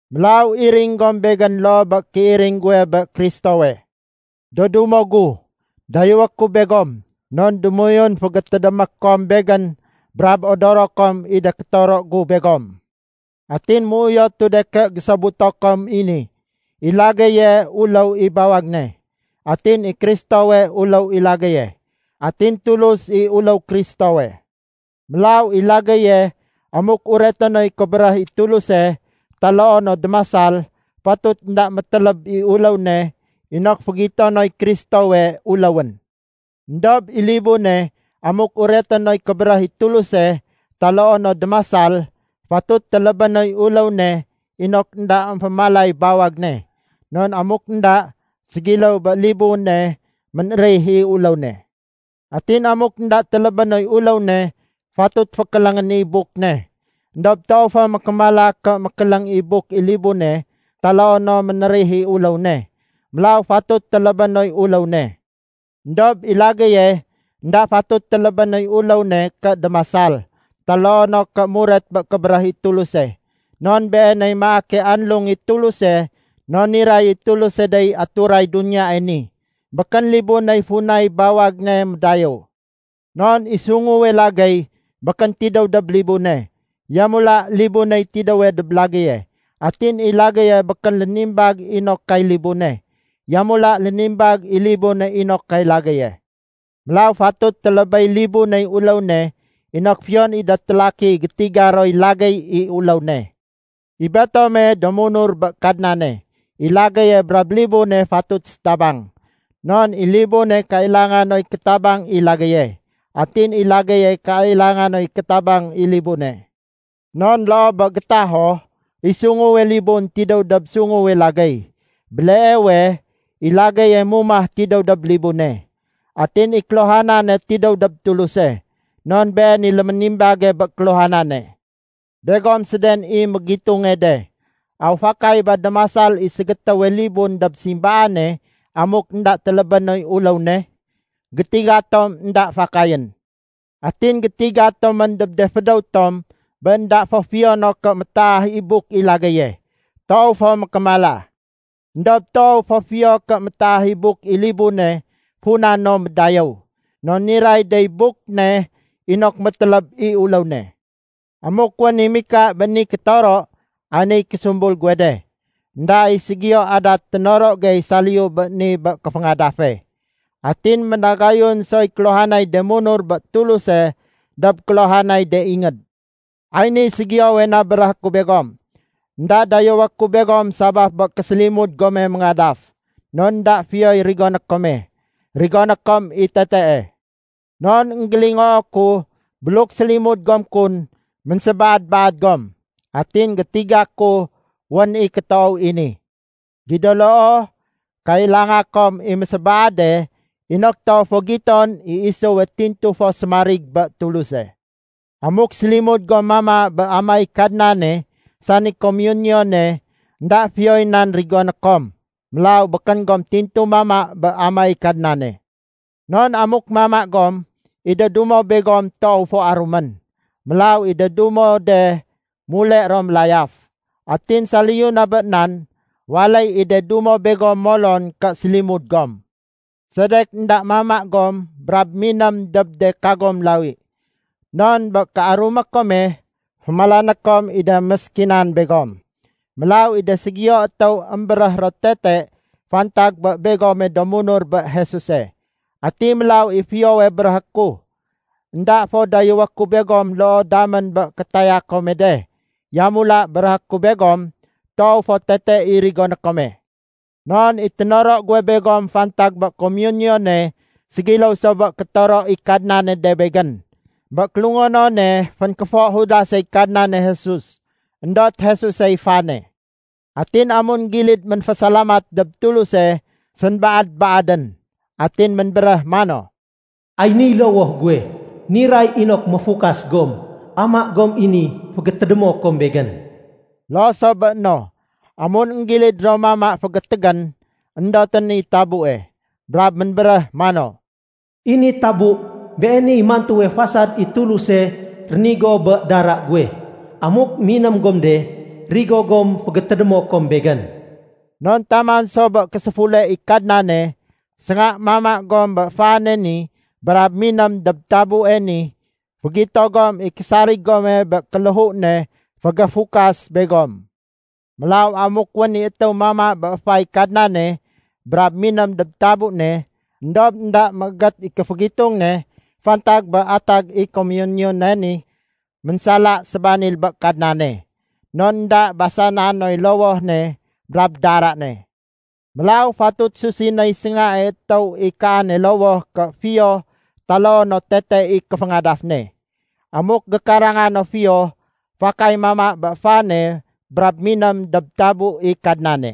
Mélaw iring gom begén loo bé kéiring guwe bé Kristowe. Do dumo gu, dayéwé ku begom, non démoyun fégétédémé kom begén brab odoro kom i de kétoro gu begom. Atin méuyotu de ké gésobuto kom i ni. I lagéye uléw i bawag ne. Atin i Kristowey uléw i lagéye. Atin Tulus i uléw Kristowe. Mélaw i lagéye amuk ureté noy kébéréh i Tuluse taloo no démasal, fatut énda météléb i uléw ne inok fégito noy Kristowe uléwén. Endob i libune amuk ureté noy kébéréh i Tuluse taloo no démasal, fatut télébé noy uléw ne inok énda émfémalay bawag ne. Non amuk énda, ségiléw bé libune ménérih i uléw ne. Atin amuk énda télébé noy uléw ne, fatut fékéléngén i buk ne. Endob toow fo mékémala ké ménkéléng i buk i libune taloo no ménérih i uléw ne, mélaw fatut télébé noy uléw ne. Endob i lagéye énda fatut télébé noy uléw ne ké démasal taloo no ké muret bé kébéréh i Tuluse. Non beeney maake anlung i Tuluse non niray i Tuluse dey aturay duniyae ni. Békén libuney funay bawag ne médayéw. Non i sunguwe lagéy békén tidéw dob libune. Yamula libuney tidéwe dob lagéye. Atin i lagéye békén lénimbag inok kay libune. Yamula lénimbag i libune inok kay lagéye. Mélaw fatut télébéy libuney uléw ne inok fiyon i de télaki gétiga roy lagéy i uléw ne. I betome do munur bé Kadnane, i lagéye brab libune fatut sétabang. Non i libune kailanga noy kétabang i lagéye. Atin i lagéye kailanga noy kétabang i libune. Non loo bé gétaho, i sunguwe libun tidéw dob sunguwe lagéy, béleewe i lagéye mumah tidéw dob libune. Atin i kéluhanane tidéw dob Tuluse, non Been i lémimbage bé kéluhanane. Begom séden i mégitunge de. Aw fakay ba démasal i ségétéwe libun dob simbaane amuk énda télébé noy uléw ne? Gétiga tom énda fakayén. Atin gétiga tomén dob de fédéw tom bé énda fo fiyo no ké métaah i buk i lagéye. Toow fo mékémala. Endob toow fo fiyo ké métaah i buk i libune funa no médayéw. Non niray dey buk ne inok météléb i uléw ne. Amuk wén i mika bé ni kétoro, ay niy késumbul guwe de. Enda i ségiyo adat ténoro gey saliyu bé ni bé kéféngadafe. Atin ménagayun soy kéluhanay de munur bé Tuluse dob kéluhanay de ingéd. Ay niy ségiyowe na béréhé ku begom. Enda dayéwé ku begom sabaf bé késélimud gome méngadaf. Non énda fiyoy rigoné kome, rigoné kom i tetee. Non énggélingoo ku, buluk sélimud gom kun, ménsébaad-baad gom. Atin gétiga ku wén i kétoow i ni. Gido loo, kailanga kom i mésébaade inok toow fo giton i isuwe tintu fo sémarig bé Tuluse. Amuk sélimud gom mama bé amaéy Kadnane sani komiyuniyune, énda fiyoy nan rigoné kom. Mélaw békén gom tintu mama bé amaéy Kadnane. Non amuk mama gom, i de dumo begom toow fo arumén. Mélaw i de dumo de mule ro mélayaf. Atin saliyu na bé nan, waléy i de dumo begom molon ké sélimud gom. Sedek énda mama gom brab miném dob de kagom lawi? Non bé kéarumé kome, fémalané kom i de méskinan begom. Mélaw i de ségiyo étéw émbéréh ro tete fantag bé begome do munur bé Jesuse. Ati mélaw i fiyowe béréhé ku? Enda fo dayéwé ku begom loo damén bé kétaya kome de. Yamula béréhé ku begom, toow fo tete i rigoné kome. Non i ténoro guwe begom fantag bé komiyuniyune ségiléw so bé kétoro i Kadnane de begén. Bé kélungonone fénkéfo Judasey Kadnane Jesus, éndot Jesusey fane. Atin amun gilid ménfésalamat dob Tuluse, sénbaad-baadén. Atin ménbéréh mano, “Ay niy lowoh guwe, niray inok méfukas gom. Ama gom i ni fégétédémo kom Begén.” Loo so bé no, amun énggilid ro mama fétémégén, éndotén i tabue. Brab ménbéréh mano, “I ni tabu, beeniy mantuwe fasad i Tuluse rénigo bé dara guwe. Amuk miném gom de, rigo gom fégétédémo kom Begén.” Non taman so bé késéfule i Kadnane, sénga mama gom bé fane ni brab miném dob tabue ni, fégito gom i késarig gome bé kéléhu ne fégéfukas begom. Mélaw amuk wén i étéw mama bé éfay Kadnane brab miném dob tabu ne, éndob énda méégét i kéfégitung ne fantag bé atag i komuniyone ni, ménsala sébanil bé Kadnane. Non énda basana noy lowoh ne brab dara ne. Mélaw fatut susinéy séngae étéw i kaane lowoh ké fiyo taloo no tete i kéféngadaf ne. Amuk gékaranga no fiyo, fakay mama bé fane brab miném dob tabu i Kadnane.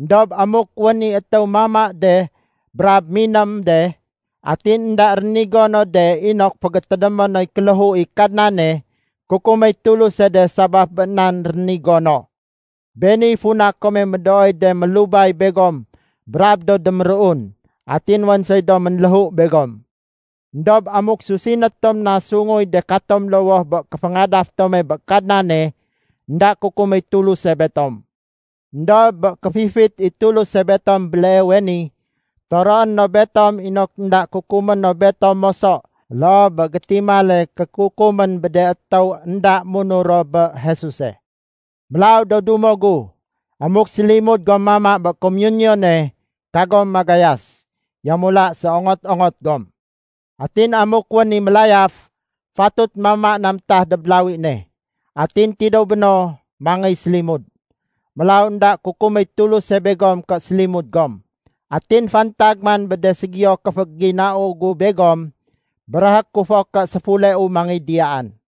Endob amuk wén i étéw mama de brab miném de, atin énda rénigo no de inok fégétédémé noy kéléhu i Kadnane, kukuméy Tuluse de sabaf bé nan rénigo no. Beeniy funa kome médooy de mélubay begom brab do déméruun, atin wén soy do ménléhu begom. Endob amuk susiné tom na sunguy de katom lowoh bé kéféngadaf tome bé Kadnane, énda kukuméy Tuluse betom. Endob bé kéfifit i Tuluse betom béleewe ni, toroé no betom inok énda kukumé no betom moso loo bé gétimale kékukumén bé de étéw énda munur ro bé Jesuse. Mélaw do dumo gu, amuk sélimud gom mama bé komiyuniyone, kagom magayas. Yamula séongot-ongot gom. Atin amuk wén i mélayaf, fatut mama na métah dob lawi ne. Atin tidéw béno, mangéy sélimud. Mélaw énda kukuméy Tuluse begom ké sélimud gom. Atin fantag man bé de ségiyo kéféginau gu begom, béréhé ku fo ké séfuleu mangéy diyaan.